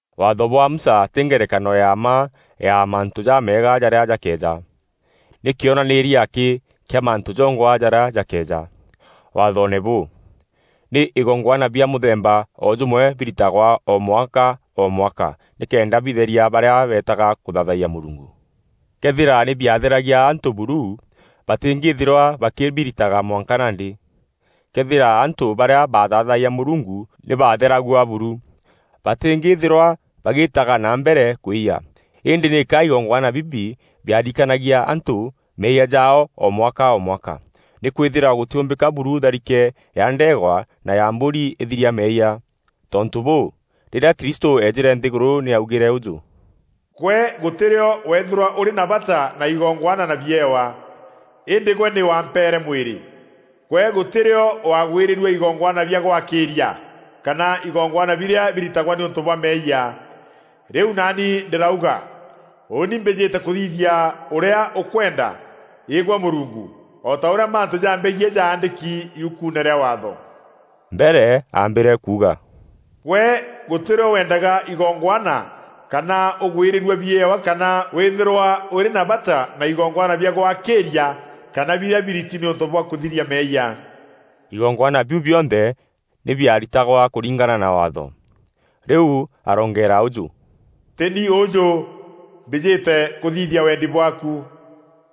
Waatho bwa Musa tî ngerekano ya mma ya mantû jameega jarîa jakeeja. Nî kîonanîîria akî kîa mantû jongwa jarîa jakeeja. Waathoone bûu, nî igongwana bia mûthemba o jûmwe biritagwa o mwaka o mwaka nîkenda bitheria barîa beetaga kûthaathayia Mûrungu. Këethîra nî biatheragia antû buru, batîngîthîrwa bakîbirîtaga mwanka nandî. Këethîra antû barîa baathaathayia Mûrungu nî baatheragua buru, batîngîthîrwa bagîîtaga na mbere kwîyia. Îndî nîka igongwana bibi biarikanagia antû meeyia jaao o mwaka o mwaka. Nîkwîthîrwa gûtîûmbîka buru tharike ya ndeegwa na ya mbûri îthiria meeyia. Tontû bûû, rîrîa Kristû eejîre nthîgûrû nî augîre ûjû: “Gwe gûtî rîo weethîrwa ûrî na bata na igongwana na biewa, îndî gwe nî wampeere mwîrî. Gwe gûtî rîo waagwîrîrua igongwana bia gwakîîria, kana igongwana birîa biritagwa nîûntû bwa meeyia. Rîu naani ndîrauga, ‘Ûûni mbîjîte kûthithia ûrîa ûkwenda, Îgwe Mûrungu,’ o ta ûrîa mantû jambegiî jaandîki yukuune rîa Waatho.” Mbere aambîre kuuga, “Gwe gûtî rîo wendaga igongwana kana ûgwîrîrua biewa kana wîthîrwa ûrî na bata na igongwana bia gwakîîria kana birîa biriti nîûntû bwa kûthiria meeyia.” Igongwana biu bionthe nî biaritagwa kûringana na Waatho. Rîu aroongeera ûjû, “Tî ni ûûjû, mbîjîte kûthithia wendi bwaaku.”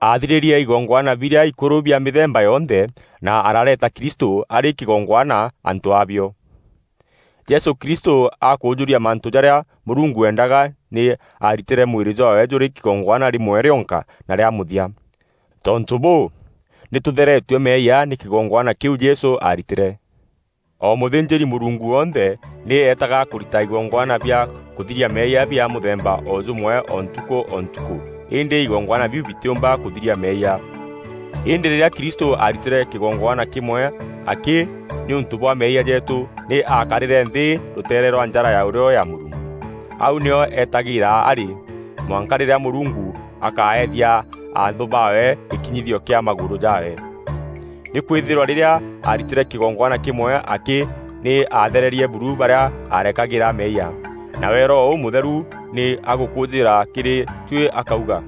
Aathirîrie igongwana birîa ikûrû bia mîthemba yonthe na arareeta Kristû arî kîgongwana antû a bio. Jesû Kristû akûûjûria mantû jarîa Mûrungu eendaga nî aaritîre mwîrî jwaawe jûrî kîgongwana rîmwe rîonka na rîa mûthia. Tontû bûû, nî tûtheretue meeyia nî kîgongwana kîu Jesû aaritîre. O mûthînjîri-Mûrungu wonthe nî eetaga kûrita igongwana bia kûthiria meeyia bia mûthemba o jûmwe o ntukû o ntukû îndî igongwana biu bitîûmba kûthiria meeyia. Îndî rîrîa Kristû aaritîre kîgongwana kîmwe akî nîûntû bwa meeyia jeetû, nî aakarîre nthî rûteere rwa njara ya ûrîo ya Mûrungu. Au nîo etagîîra arî, mwanka rîrîa Mûrungu akaethia anthû baawe gîkinyithio kîa magûrû jaawe. Nîkwîthîrwa rîrîa aaritîre kîgongwana kîmwe akî, nî aathererie buru barîa arekagîra meeyia. Nawe Roho Ûmûtheru nî agûkûûjîîra kîrî tuî akauga,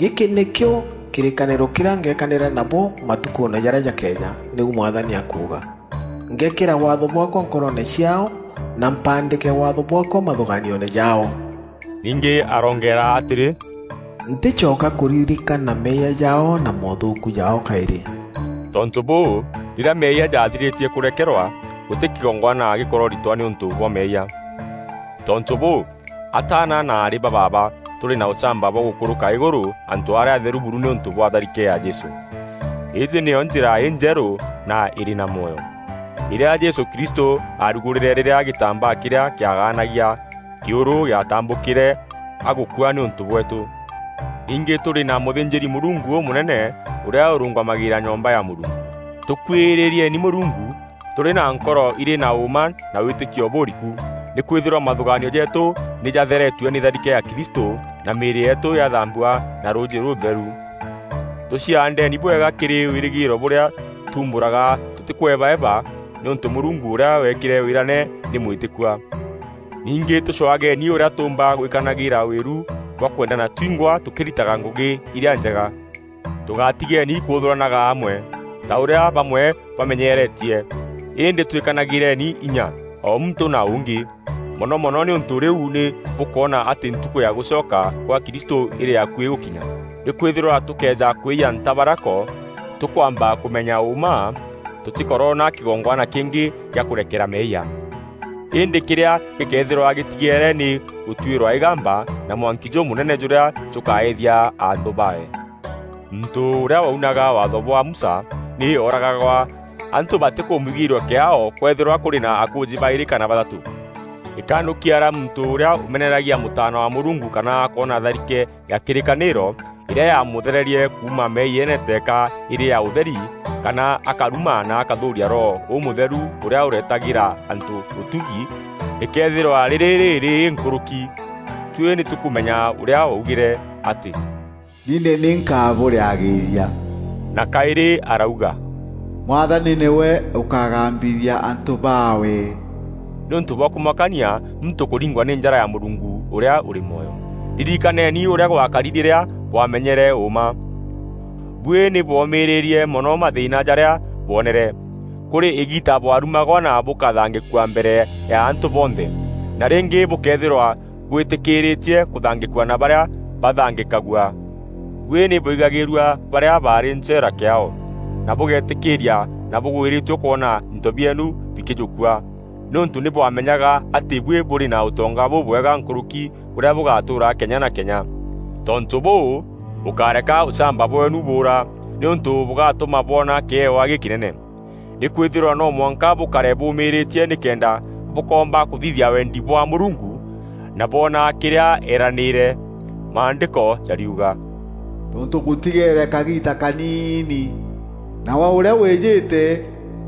“Gîkî nîkîo kîrîkanîro kîrîa ngekanîra nabo matukûûne jarîa jakeeja, nîu Mwathani akuuga: Ngekîra Waatho bwaakwa nkoroone ciaao, na mpaandîke Waatho bwaakwa mathûgaanioone jaao.” Ningî aroongeera atîrî, “Ntîcoka kûririkana meeyia jaao na moothûûku jaao kaîrî.” Tontû bûû, rîrîa meeyia jathirîtie kûrekerwa, gûtî kîgongwana gîkororitwa nîûntû bwa meeyia. Tontû bûû, ataana na aarî ba baaba, tûrî na ûchamba bwa gûkûrûka îgûrû, antû arîa atheru buru nîûntû bwa tharike ya Jesû. Îîjî nîyo njîra injerû na îrî na mwoyo, îrîa Jesû Kristû aarugûrîre rîrîa gîtambaa kîrîa kîagaanagia kîûrû gîatambûkîre agûkua nîûntû bweetû. Ningî tûrî na mûthînjîri-Mûrungu ûmûnene ûrîa ûrûngamagîîra nyomba ya Mûrungu. Tûkuîrîrieni Mûrungu tûrî na nkoro irî na ûûma na wîtîkio bûûriku. Nîkwîthîrwa mathûgaanio jeetû nî jatheretue nî tharike ya Kristû na mîîrî yeetû yathambua na rûûjî rûûtheru. Tûciaandeni bwega kîrî wîrîgîîro bûrîa tuumbûraga tûtîkûebaeba nîûntû Mûrungu ûrîa weekîre wîrane nî mwîtîkua. Ningî tûcwageni ûrîa tûûmba gwîkanagîra wîru bwa kwendana twingwa tûkîritaga ngûgî irîa njega. Tûgatigeeni kûûthûranaga amwe, ta ûrîa bamwe bamenyeretie, îndî twîkanagîreni inya o muntû na ûngî, mono mono nîûntû rîu nî bûkwona atî Ntukû ya gûcoka gwa Kristû îrî akuî gûkinya. Nîkwîthîrwa tûkëeja kwîyia ntabarako tûkwamba kûmenya ûûma, tûtîkoroona kîgongwana kîngî gîa kûrekera meeyia, Îndî kîrîa gîkeethîrwa gîtigeere nî gûtuîrwa îgamba na mwanki jûmûnene jûrîa jûkaîîthia anthû baawe. Muntû ûrîa waunaga Waatho bwa Musa nî ooragagwa antû batîkûmwigîîrua kîaao kwëethîrwa kûrî na akûûjî baîrî kana bathatû. Îkanûkia rîa muntû ûrîa ûmeneragia Mûtaana wa Mûrungu kana akoona tharîke ya kîrîkanîro, îrîa yaamûthererie kuuma meeyiene teeka îrî ya ûtheri kana akaruma na akûthûûria Roho Ûmûtheru ûrîa ûreetagîra antû ûtugi rîkeethîrwa rîrî rîrîî nkûrûki. Tuî nî tûkûmenya ûrîa waugîre atî, “Nî ni nkabûrîagîîria,” na kaîrî arauga, “Mwathani nîwe ûkagambithia antû baawe.” Nî ûntû bwa kûmakania muntû kûringwa nî njara ya Mûrungu ûrîa ûrî mwoyo! Ririkaneeni ûrîa gwakari rîrîa bwamenyere ûûma; buî nî bwomîîrîrie mono mathîîna jarîa bwonere. Kûrî îgiita bwarumagwa na bûkathangîkua mbere ya antû bonthe, na rîngî bûkeethîrwa bwîtîkîîrîtie kûthangîkua na barîa baathangîkagua. Buî nî bwaigagîîrua barîa baarî ncheera kîaao na bûgeetîkîîria na bûgwîrîtue kwona into bieenu bikîjûkua, nîûntû nî bwamenyaga atî buî bûrî na ûtonga bûbwega nkûrûki bûrîa bûgatûûra kenya na kenya. Tontû bûû, bûkáreka ûchamba bweenu bûûra, nîûntû bûgatûma bwona kîewa gîkînene. Nîkwîthîrwa no mwanka bûkare bûûmîîrîtie nîkenda bûkoomba kûthithia wendi kwa Mûrungu na bwoona kîrîa eeranîîre. Maandîko jariuga, “Tontû gûtigeere kagiita kaniini, nawe ûrîa wîjîte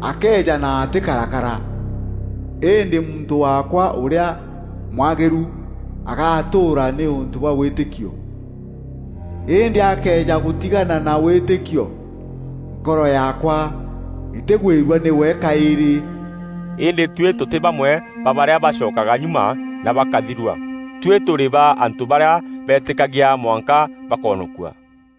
akeeja na atîkarakara; îndî muntû waakwa ûrîa mwagîru agatûûra nîûntû bwa wîtîkio, îndî akëeja gûtigana na wîtîkio, nkoro yaakwa îtîgwîrua nîwe kaîrî.” Îndî tuî tûtî bamwe ba barîa bacokaga nyuma na bakathirua. Tuî tûrî ba antû barîa beetîkagia mwanka bakoonokua.